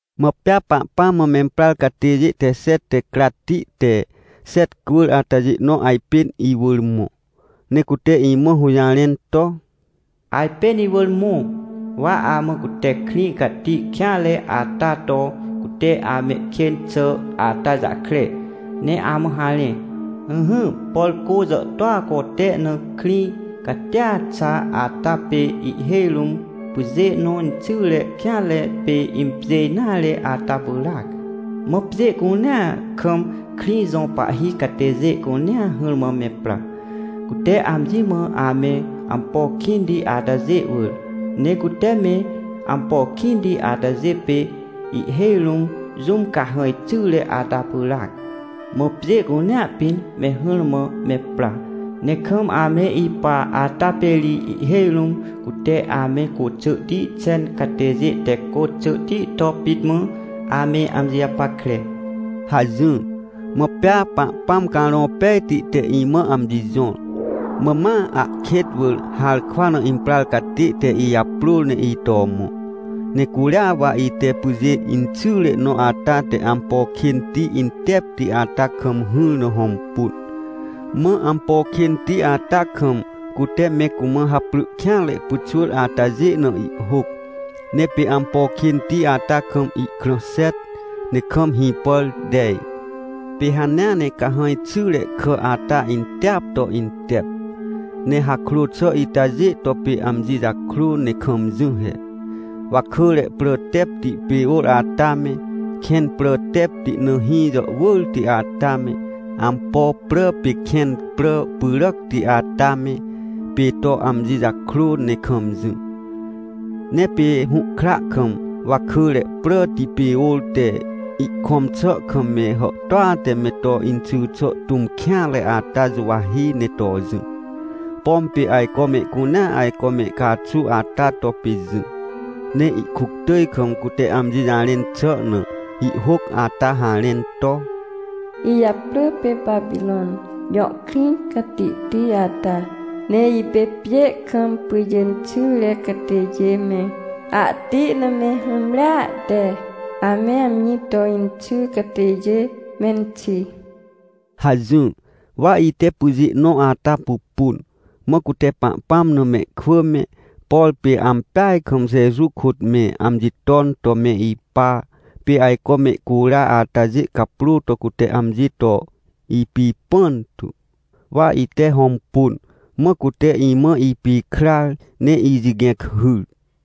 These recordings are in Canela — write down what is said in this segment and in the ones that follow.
Mã pea Pahpãm mã memprar catêjê te xet te cratti te xet cwỳr atajê nõ ajpên iwỳr mõ, ne cute imã hũjarẽn to: — Ajpên iwỳr mõ, wa amã cute krĩ cati kêanre ata to cute amehkên xà ata jahkre, ne amã harẽ. Ỹhỹ, por cô jàhtôa cote na, krĩ catia xa ata pê ihhêj rũm pyjê nõ inxyre kêanre pê impjê nare ata pyràac. Mã pjê cunea kam krĩ jo pahhi catêjê cunea hỹrmã me pra, cute amji mã ame ampo kĩnti atajê wỳr. Ne cute me ampo kĩnti atajê pê ihhêj rũm jũm cahãj xyre ata pyràac. Mã pjê cunea pĩn me hỹrmã me pra, ne kam ame ipa ata pê ri ihhêj rũm cute ame côxỳhti xen catêjê te côxỳhti to pit mã ame amji japackre — hajỹr. Mã pea Pahpãm Carõ Pejti te imã amji jõr, mã ma ahkêt wỳr harkwa na imprar catê te ijaprôr ne ito mõ. Ne curia wa ite pyjê inxyre nõ ata te ampo kênti intepti ata kam hỹr na hõmpun. Mã ampo kênti ata kam, cute me cumã haprỳ kêanre pyxwỳr atajê na ihhôc. Ne pê ampo kênti ata kam ihkrã xet, ne kam hĩpàr tej. Pê hanea ne cahãj xyre kà ata inteap to intep, ne hakrô xà itajê to pê amji jakrô ne kam jỹ he. Wakỳre prà tepti pê ôr ata me, kẽn prà tepti na hĩ jàhwỳrti ata me, ampo prà pê kẽn prà pyràcti ata me, pê to amji jakrô ne kam jỹ. Ne pê hũhkra kam wakỳre pràti pê ôr te ihkõm xà kam me hàhtôa te me to inxỳ xà tũm kêanre ata juwahi ne to jỹ, pom pê ajco mehcunea ajco me caxu ata to pê jỹ. Ne ihkuctỳj kam cute amji jarẽn xà na, ihhôc ata harẽn to: — Ijaprỳ pê Papirõn jõ krĩ catihti ata, ne ipê pjê kam pyjê inxyre catêjê me, ahti na me hũmrea te ame amji to inxy catêjê menxi — hajỹr. Wa ite pyjê nõ ata pupun, mã cute Pahpãm na mehkwỳ me, por pê ampeaj kam Jeju kôt me amji ton to me ipa, pê ajco mehcura atajê caprô to cute amji to ipipãn tu. Wa ite hõmpun, mã cute imã ipikrar ne ijigẽc hyr.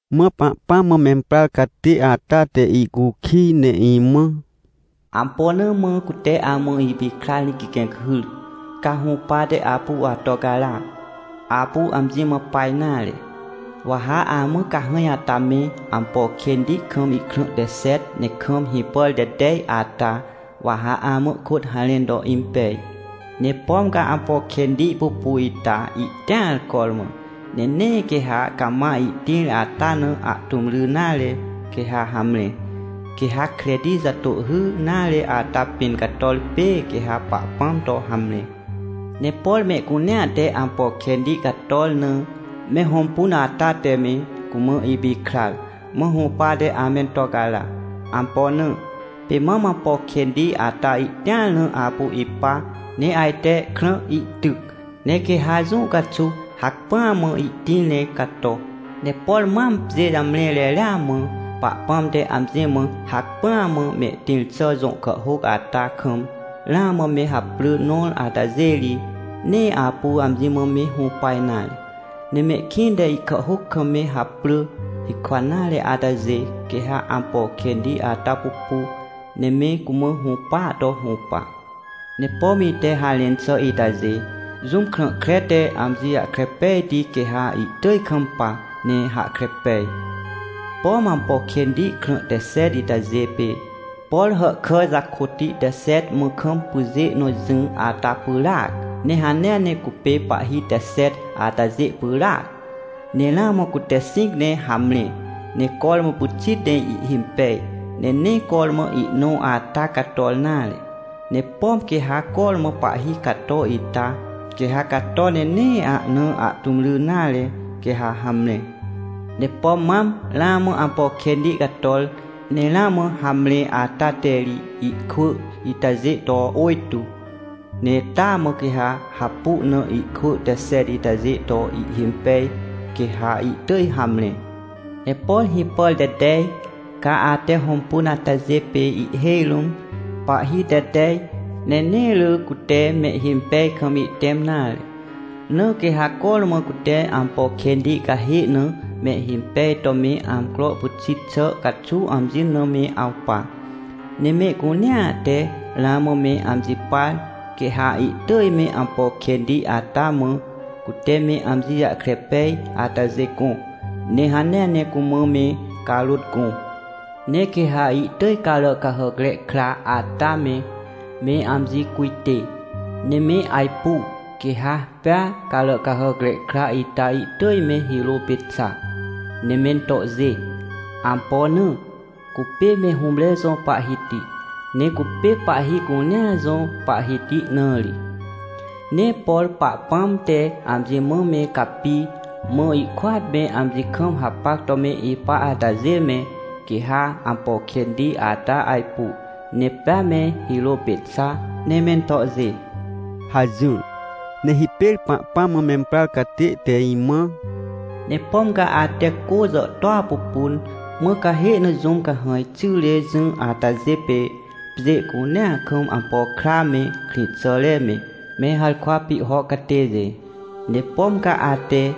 Mã Pahpãm mã memprar catê ata te icukij ne imã: — Ampo na mã cute amã ipikrar ne gigẽc hyr, ca hũpate apu ato cara? Apu amji mã pa nare, wa ha amã cahãj ata me, ampo kênti kam ihkrã te xet ne kam hĩpàr te tej ata, wa ha amã kôt harẽn to impej. Ne pom ca ampo kênti pupu ita, ihtĩar cormã, ne nee quê ha cama ihtĩr ata na ahtũm ry nare, quê ha hamre. Quê ha kreti jatôhhy nare ata pĩn cator pê, quê ha Pahpãm to hamre. Ne por mehcunea te ampo kênti cator na me hõmpun ata te me cumã ipikrar, mã hũpate amento cara. Ampo na? Pê mam ampo kênti ata ihtĩar na apu ipa, ne ajte krã ihtyc, ne quê ha jũ caxuw hacpỹa mã ihtĩr ne cato. Ne por mam, pjê jamre reria mã Pahpãm te amji mã hacpỹa mã mehtĩr xà jõ kàhhôc ata kam ramã me haprỳ nõr atajê ri, nee apu amji mã me hũpa nare. Ne mehkĩnte ihkàhhôc kam me haprỳ hikwa nare atajê, quê ha ampo kênti ata pupu, ne me cumã hũpaa to hũpa. — Ne pom ite harẽn xà itajê, jũm krã kre te amji jahkre pejti quê ha ihtỳj kampa, ne hahkre pej. Pom ampo kênti krã te xet itajê pê, por hàhkà jakôtti te xet mã kam pyjê nõ jỹ ata pyràac. Ne hanea ne cupê pahhi te xet atajê pyràac. Ne ramã cute xĩc ne hamre, ne cormã pyxit ne ihhimpej, ne nee cormã ihnõ ata cator nare. Ne pom quê ha cormã pahhi cato ita, quê ha cato ne nee ahna ahtũm ry nare, quê ha hamre. Ne pom mam ramã ampo kênti cator, ne ramã hamre ata te ri ihkwỳ itajê to ôjtô, ne taa mã quê hapu na ihkwỳ te xet itajê to ihhimpej, quê ha ihtỳj hamre. — Ne por hĩpàr te tej, ca ate hõmpun atajê pê ihhêj rũm pahhi te tej, ne nee rỳ cute mehhimpej kam ihtẽm nare. Na quê ha cormã cute ampo kênti cahê na mehhimpej to me amcro pyxit xà caxuw amji na me awpa. Ne mehcunea te ramã me amji par, quê ha ihtỳj me ampo kênti ata mã cute me amji jahkre pej atajê gõ, ne hanea ne cumã me carôt gõ. Ne quê ha ihtỳj Caràcahàcre Kra ata me, me amji cujtê, ne me ajpu, quê ha pea Caràcahàcre Kra ita ihtỳj me hirô pê xa, ne me tohjê. Ampo na? Cupê me hũmre jõ Pahhiti, ne cupê pahhi cunea jõ Pahhiti na ri. Ne por Pahpãm te amji mã me capi, mã ihkôat me amji kam hapac to me ipa atajê me, quê ha ampo kênti ata ajpu, ne pea me hirô pê xa, ne me tohjê — hajỹr. Ne hipêr Pahpãm mã memprar catê te imã: — Ne pom ca ate cô jàhtôa pupun, mã cahê na jũm cahãj xyre jỹ atajê pê pjê cunea kam ampo kra me, krĩxàre me, me harkwa pihho catêjê. Ne pom ca ate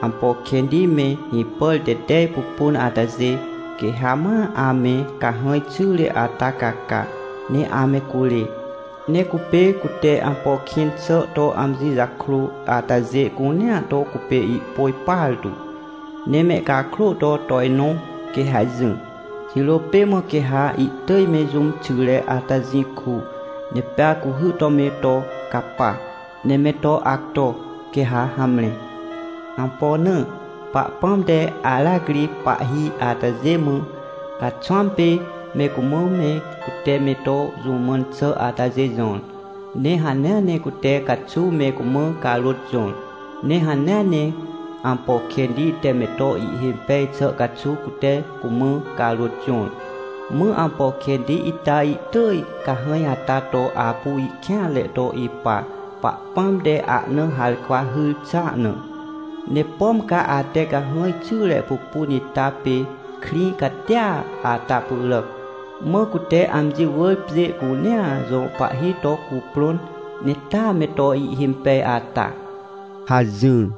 ampo kênti me, hĩpàr te tej pupun atajê, quê ha ma ame cahãj xyre ata caca, ne ame curê. Ne cupê cute ampo kĩn xà to amji jakrô atajê cunea to cupê ihpôj partu, ne mehcakrô to tojnõ quê ha jỹ. Jirô pê mã quê ha ihtỳj me jũm xyre ata jĩ ku, ne pea cuhy to me to capa, ne me to acto, quê ha hamre. Ampo na? Pahpãm te aracri pahhi atajê mã caxwãm pê me cumã me cute me to jũ mãn xà atajê jõr, ne hanea ne cute caxuw me cumã carôt jõr. Ne hanea ne ampo kênti te me to ihhimpej xà caxuw cute cumã carôt jõr, mã ampo kênti ita ihtỳj cahãj ata to apu ihkêanre to ipa, Pahpãm te ahna harkwa hyr xà na. Ne pom ca ate cahãj xyre pupun ita pê krĩ catia ata pyràc, mã cute amji wỳr pjê cunea jõ pahhi to cuprõn, ne taa me to ihhimpej ata — hajỹr.